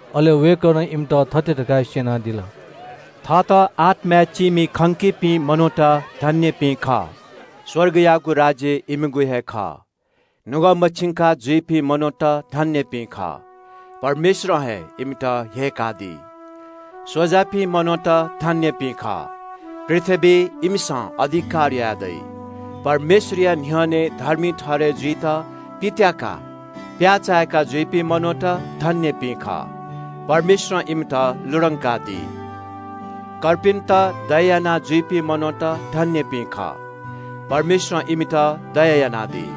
अले वय्कलं इमित थथे धकाः स्यनादिल – “थःत आत्माय् चीमि खंकीपिं मनूत धन्यपिं खः, स्वर्गयागु राज्य इमिगु हे खः। नुगः मछिंका जुइपिं मनूत धन्यपिं खः, परमेश्वरं हे इमित ह्यय्कादी। स्वजापिं मनूत धन्यपिं खः, पृथ्वीइ इमिसं अधिकार यायेदइ। परमेश्वरया न्ह्यःने धर्मी ठहरय् जुइत पित्याकाः प्याय्चाय्का जुइपिं मनूत धन्यपिं खः, परमेश्वरं इमित लुधंकादी। कर्पिन्त दया यानाजुइपिं मनूत धन्यपिं खः, परमेश्वरं इमित दया यानादी।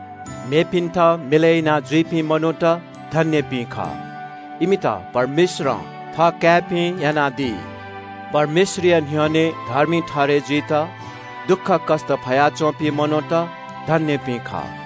मेपिन्त मिलय् यानाजुइपिं मनूत धन्यपिं खः, इमित परमेश्वरं थःकाय्पिं यानादी। परमेश्वरया न्ह्यःने धर्मी ठहरय् जुइत दुःखकष्ट फयाच्वंपिं मनूत धन्यपिं खः,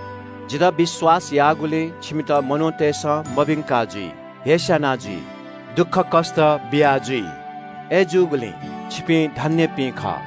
“जितः विश्वास याःगुलिं छिमित मनूतय्सं मभिंका जुइ, हेस्याना जुइ, दुःखकष्ट बियाजुइ। अय्जूगुलिं छिपिं धन्यपिं खः। #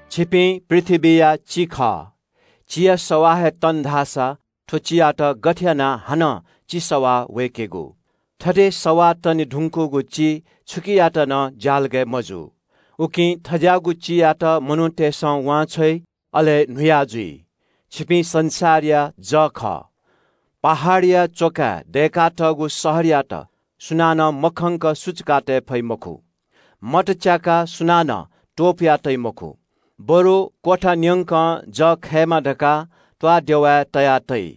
“छिपिं पृथ्वीया चि खः। चिया सवाः हे तन धाःसा थ्व चियात गथे यानाः हानं चि सवाः वय्केगु? थथे सवाः तने धुंकूगु चि छुकियात नं ज्यालगय् मजू, उकिं थज्याःगु चियात मनूतय्सं वांछ्वइ, अले न्हुया जुइ। “छिपिं संसारया जः खः। पहाडया च्वकाय् दय्कातःगु शहरयात सुनानं मखंक सुचुकातये फइ मखु। मत च्याकाः सुनानं त्वपुयातइ मखु, बरु क्वथा न्यंक जः खयेमा धकाः त्वाःदेवाय् तयातइ।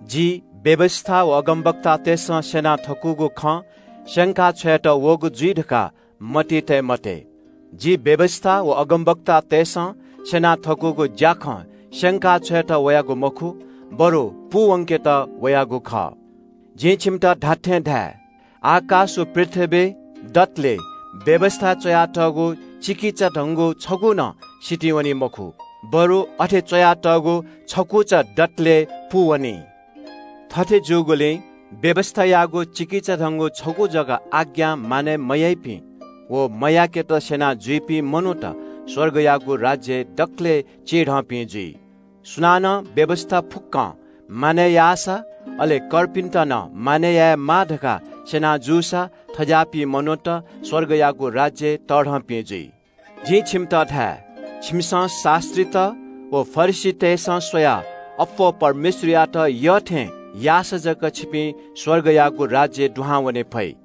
“जि व्यवस्था व अगमवक्तातय्सं स्यना थकूगु खँ स्यंका छ्वयेत वःगु जुइ धकाः मतिइ तये मते। जि व्यवस्था व अगमवक्तातय्सं स्यना थकूगु ज्याखँ स्यंका छ्वयेत वयागु मखु, बरु पूवंकेत वयागु खः। जिं छिमित धात्थें धाये – आकाश व पृथ्वी दतले व्यवस्थाय् च्वयातःगु चिकिचाधंगु छगू नं सितिं वनी मखु, बरु अथे च्वयातःगु छकुचा दतले पूवनी। थथे जूगुलिं व्यवस्थायागु चिकिचाधंगु छगू जक आज्ञा मानय् मयाइपिं व मयाकेत स्यना जुइपिं मनूत स्वर्गयागु राज्यय् दकलय् चिधंपिं जुइ। सुनानं व्यवस्था फुक्कं मानय् याःसा, अले कर्पिन्त नं मानय् यायेमाः धकाः स्यना जूसां थज्याःपिं मनूत स्वर्गयागु राज्यय् तःधंपिं जुइ। “जिं छिमित धाये – छिमिसं शास्त्रीत व फरिसीतय्सं स्वयाः अप्वः परमेश्वरयात यःथें याःसा जक छिपिं स्वर्गयागु राज्यय् दुहां वने फइ।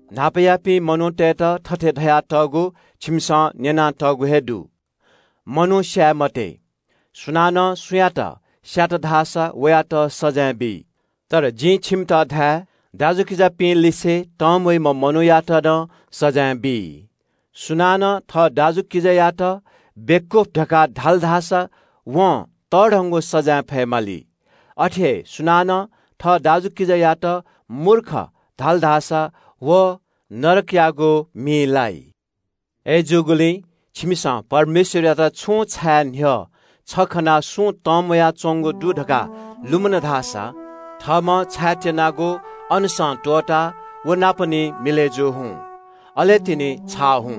“न्हापायापिं मनूतय्त थथे धयातःगु छिमिसं न्यनातःगु हे दु – ‘मनू स्याये मते, सुनानं सुयातं स्यात धाःसा वयात सजाँय बी।’ तर जिं छिमित धाये – दाजुकिजापिंलिसे तंम्वइम्ह मनूयात नं सजाँय बी। सुनानं थः दाजुकिजानापं छुं म्वाय्क ल्वापु थल धाःसा वं तःधंगु सजाँय फयेमाली। अथे हे सुनानं थः दाजुकिजायात ‘ध्वादः’ धाल धाःसा व नरकयागु मिइ लाइ। “अय्जूगुलिं छिमिसं परमेश्वरयात छुं छाये न्ह्यः छ खनाः छिमि किजा तंम्वया च्वंगु दु धकाः लुमन धाःसा थःम्हं छायेत्यनागु वेदीया न्ह्यःने हे त्वःताः किजानापं निं मिलय् जू हुँ, अले तिनि छाः हुँ।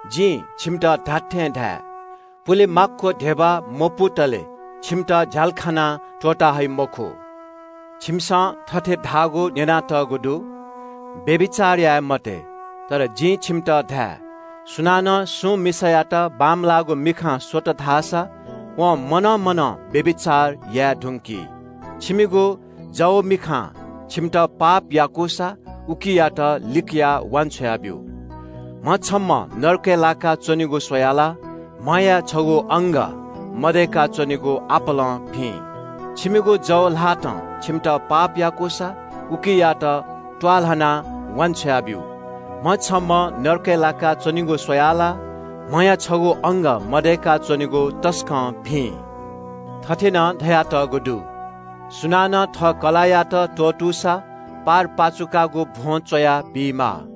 जिं छिमित धात्थें धाये – पुले माक्व धिबा मपुतले छिमित झ्यालखानां त्वःता हइ मखु। “छिमिसं थथे धाःगु न्यनातःगु दु – ‘व्यभिचार याये मते।’ तर जिं छिमित धाये – सुनानं सुं मिसायात बांमलाःगु मिखां स्वल धाःसा वं मनं मनं व्यभिचार याये धुंकी। छंगु जव मिखां छन्त पाप याकूसा उकियात लिकयाः वान्छ्वया ब्यु। म्ह छम्हं नरकय् लाकाः च्वनेगु स्वयाः ला म्हया छगू अंग मदय्का च्वनेगु आपालं भिं। छंगु जव ल्हातं छन्त पाप याकूसा उकियात त्वाःल्हानाः वान्छ्वया ब्यु। म्ह छम्हं नरकय् लाका च्वनेगु स्वयाः ला म्हया छगू अंग मदय्का च्वनेगु तसकं भिं। “थथे नं धयातःगु दु – ‘सुनानं थः कलाःयात त्वःतूसा पारपाचुकागु भ्वं च्वयाः बीमाः।’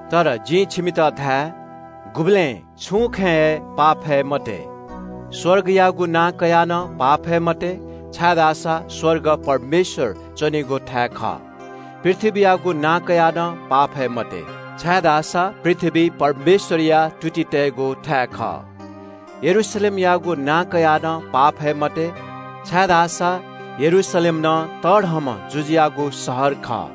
तर जिं छिमित धाये – गुबलें छुं खँय् हे पाफये मते। स्वर्गयागु नां कयाः नं पाफये मते, छाय्धाःसा स्वर्ग परमेश्वरया सिंहासन खः। पृथ्वीयागु नां कयाः नं पाफये मते, छाय्धाःसा पृथ्वी परमेश्वरया तुति तइगु थाय् खः। यरूशलेमयागु नां कयाः नं पाफये मते, छाय्धाःसा यरूशलेम तःधंम्ह जुजुयागु शहर खः।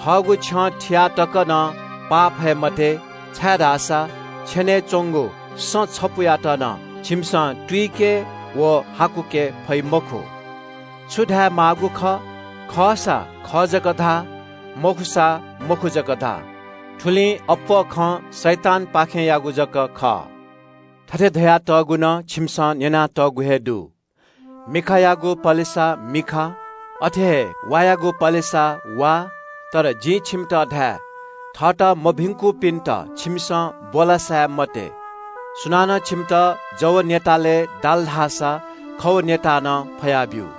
थःगु छ्यं थियाः तक नं पाफये मते, छाय्धाःसा छेनय् च्वंगु सँ छपुयात नं छिमिसं तुइके व हाकुके फइ मखु। छु धायेमाःगु खः – खःसा खः जक धा, मखुसा मखु जक धा। थुलिं अप्वः खँ शैतानपाखेंयागु जक खः। “थथे धयातःगु नं छिमिसं न्यनातःगु हे दु – ‘मिखायागु पलेसा मिखा, वायागु पलेसा वा।’ तर जिं छिमित धाये – थःत मभिंकूपिन्त छिमिसं ब्वलासाये मते। सुनानं छिमित जव न्यतालय् दाल धाःसा खव न्यताः नं फया ब्यु।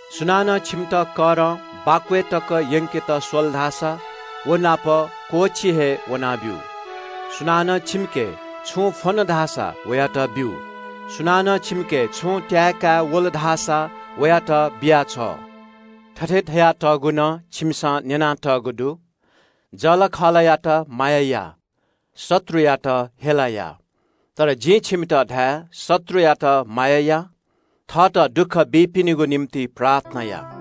सुनानं छन्त करं छगू किलोमिटर तक यंकेत स्वल धाःसा व नाप निगू किलोमिटर हे वना ब्यु। सुनानं छंके छुं फ्वन धाःसा वयात ब्यु। सुनानं छंके छुं त्याये का वल धाःसा वयात बिया छ्व। “थथे धयातःगु नं छिमिसं न्यनातःगु दु – ‘जःलाखःलायात माया या, शत्रुयात हेला या।’ तर जिं छिमित धाये – शत्रुयात माया या, थःत दुःख बीपिनिगु निंतिं प्रार्थना या।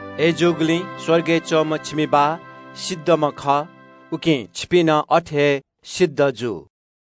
अय्जूगुलिं स्वर्गय् दीम्ह छिमि बाः सिद्धम्ह खः, उकिं छिपिं नं अथे हे सिद्ध जु।